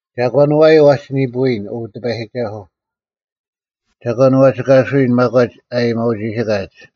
ᒐᒂᓐ ᐛᔪᐤ ᐛᒋ ᓂᐳᔨᓐ, ᐅ ᑎᐸᔨᒋᒐᓱᐤ? ᒐᒂᓐ ᐛᒋ ᑲᓱᔨᓐ ᒪᒂᒡ ᐊ ᐊᔨᒥᐅᒋᓯᑲᒋ?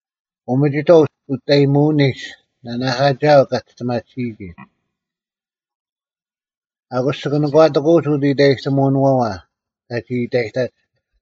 ᐅᒥᒋᑥᐤ ᐅᒋᔅᑕᔨᒧᐅᓂᒡ ᓇᓇᐧᑲᒋᐊᐤ ᑲ ᒋᔅᑎᒪᑎᓯᔨᒋ᙮ ᐊᑯᔅ ᒋᑭ ᓇᒂᑎᑯᐅᒡ ᐅᑦ ᐃᑕᔨᑎᒧᐅᓄᐛᐛ ᑲᒋ ᐃᑕᔨᑕᒡ᙮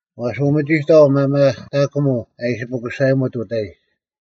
ᐛᔅ ᐅᒥᒋᑥᐤ ᒪᒪᑕᑯᒧᐤ ᐊ ᐃᓯ ᐱᑯᓴᔨᒧᑦ ᐅᑕᐃᒡ,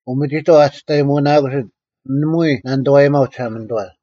ᐅᒥᒋᑥᐤ, ᐊ ᒋᔅᑕᔨᒧᓇᑯᓯᑦ, ᓇᒪᐎᔾ ᓇᓂᑐᐛᔨᒪᐤ ᒋᓴᒪᓂᑐᐛ: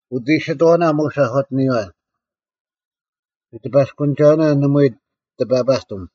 ᐅᑦ ᐃᓯᑥᐅᓇ ᒧᔅ ᐊᒂᑎᓂᔪᐛ; ᒋᑎᐸᔅᑯᓂᒐᐅᓇ ᓇᒪᐎᔾ ᑕᐸᐸᑎᒻ: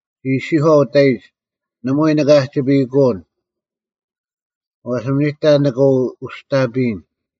ᒋ ᐃᔅᒋᔄᐤ ᐅᑕᐃᒡ, “ᓇᒪᐎᔾ ᓂᑭ ᐊᒋᐸᔨᐃᑯᐅᓐ: ᐛᔅ ᓇᒪ ᓂᑕ ᓂᑭ ᐅᔅᑕᐱᔨᓐ᙮”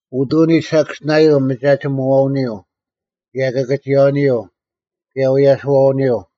ᐅᑐᓂᒡ ᓴᑭᔅᒋᓇᔪᐤ ᒪᒐᒋᒧᐛᐅᓂᔪᐤ, ᑭᔭ ᑭᑭᒋᔭᐅᓂᔪᐤ, ᑭᔭ ᐛᔭᓯᐃᐛᐅᓂᔪᐤ: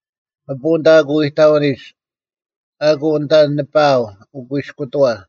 ᐊᐳᐤ ᐊᓐᑕ ᐊᑯ ᐃᑕᐅᓂᓯᒡ: ᐊᑯ ᐊᓐᑕ ᓂᐸᐊᐤ ᐅᑯᐃᔅᑯᑎᐛ: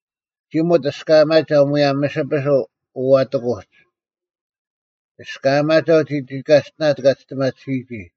ᒋᒧᑦ ᐊᔅᑲᒪᒐᐤ ᒧᔭᒻ ᒥᓯᐱᓱᐤ ᐅᐛᑎᑯᒡ: ᐊᔅᑲᒪᒐᐤ ᒐᒋ ᑲᔅᑎᓇᑦ ᑲ ᒋᔅᑎᒪᑎᓯᔨᒋ,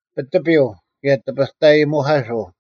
ᐱᑎᐱᐤ, ᑭᔭ ᑎᐱᑕᔨᒧᐧᑲᓱᐤ,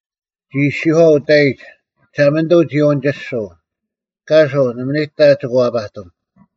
ᒋ ᐃᔅᒋᔄᐤ ᐅᑕᐃᒡ, “ᒋᓴᒪᓂᑐᐤ ᒋ ᐅᓂᒋᔅᒍᐤ: ᑲᓱᐤ, ᓇᒪ ᓂᑕ ᒋᑭ ᐛᐸᑎᒻ᙮”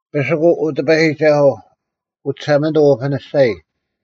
ᐱᓯᑯᐤ, ᐅ ᑎᐸᔨᒋᒐᓱᐤ: ᐅ ᒋᓴᒪᓂᑐᐤ, ᐅᐱᓂᔅᒐᔨ;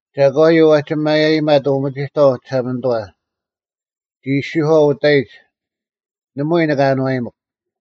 ᒐᒂᔪᐤ ᐛᒋ ᒪᔭᔨᒪᑦ ᐅᒥᒋᑥᐤ ᒋᓴᒪᓂᑐᐛ? ᒋ ᐃᔅᒋᔄᐤ ᐅᑕᐃᒡ, “ᓇᒪᐎᔾ ᓂᑭ ᐊᓏᔨᒥᒄ᙮”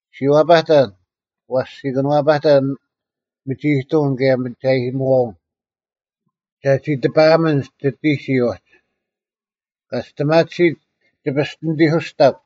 ᔅᒋ ᐛᐸᑕᓐ; ᐛᔅ ᒋ ᑭᓄᐛᐸᑕᓐ ᒥᒋᐃᑐᐅᓐ ᑭᔭ ᒥᒐᔨᒧᐛᐅᓐ, ᒐᒋ ᑎᐸᐊᒥᓐ ᒋᑎᒋᔾ ᐅᒡ: ᑲ ᒋᔅᑎᒪᑎᓯᑦ ᒋ ᐱᔅᑎᓂᑎᓱᔅᑕᒃ: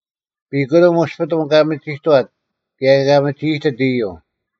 ᐱᑯᓂᒻ ᐅᔅᐱᑐᓐ ᑲ ᒥᒋᑥᑦ ᑭᔭ ᑲ ᒥᒋ ᐃᑎᑦ ᐃᔪᐤ: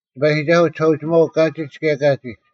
ᑎᐸᔨᒋᒐᓱᐤ ᒋᓴᐅᒋᒪᐅᐤ ᑲᒋᒡ ᑭᔭ ᑲᒋᒡ: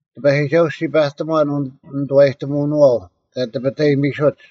ᑎᐸᔨᒋᒐᓱᐤ, ᔅᒋ ᐸᑎᒺᓐ ᐅᓂᑐᐛᔨᑎᒧᐅᓄᐛᐤ ᑲ ᑎᐱᑕᔨᒥᓱᒡ: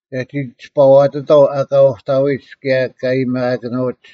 ᒐᒋ ᒋᔅᐸᐛᑎᑥᐤ ᐊᑲ ᐅᑕᐎᒡ ᑭᔭ ᑲ ᐊᔨᒥᐊᑭᓄᐅᒡ,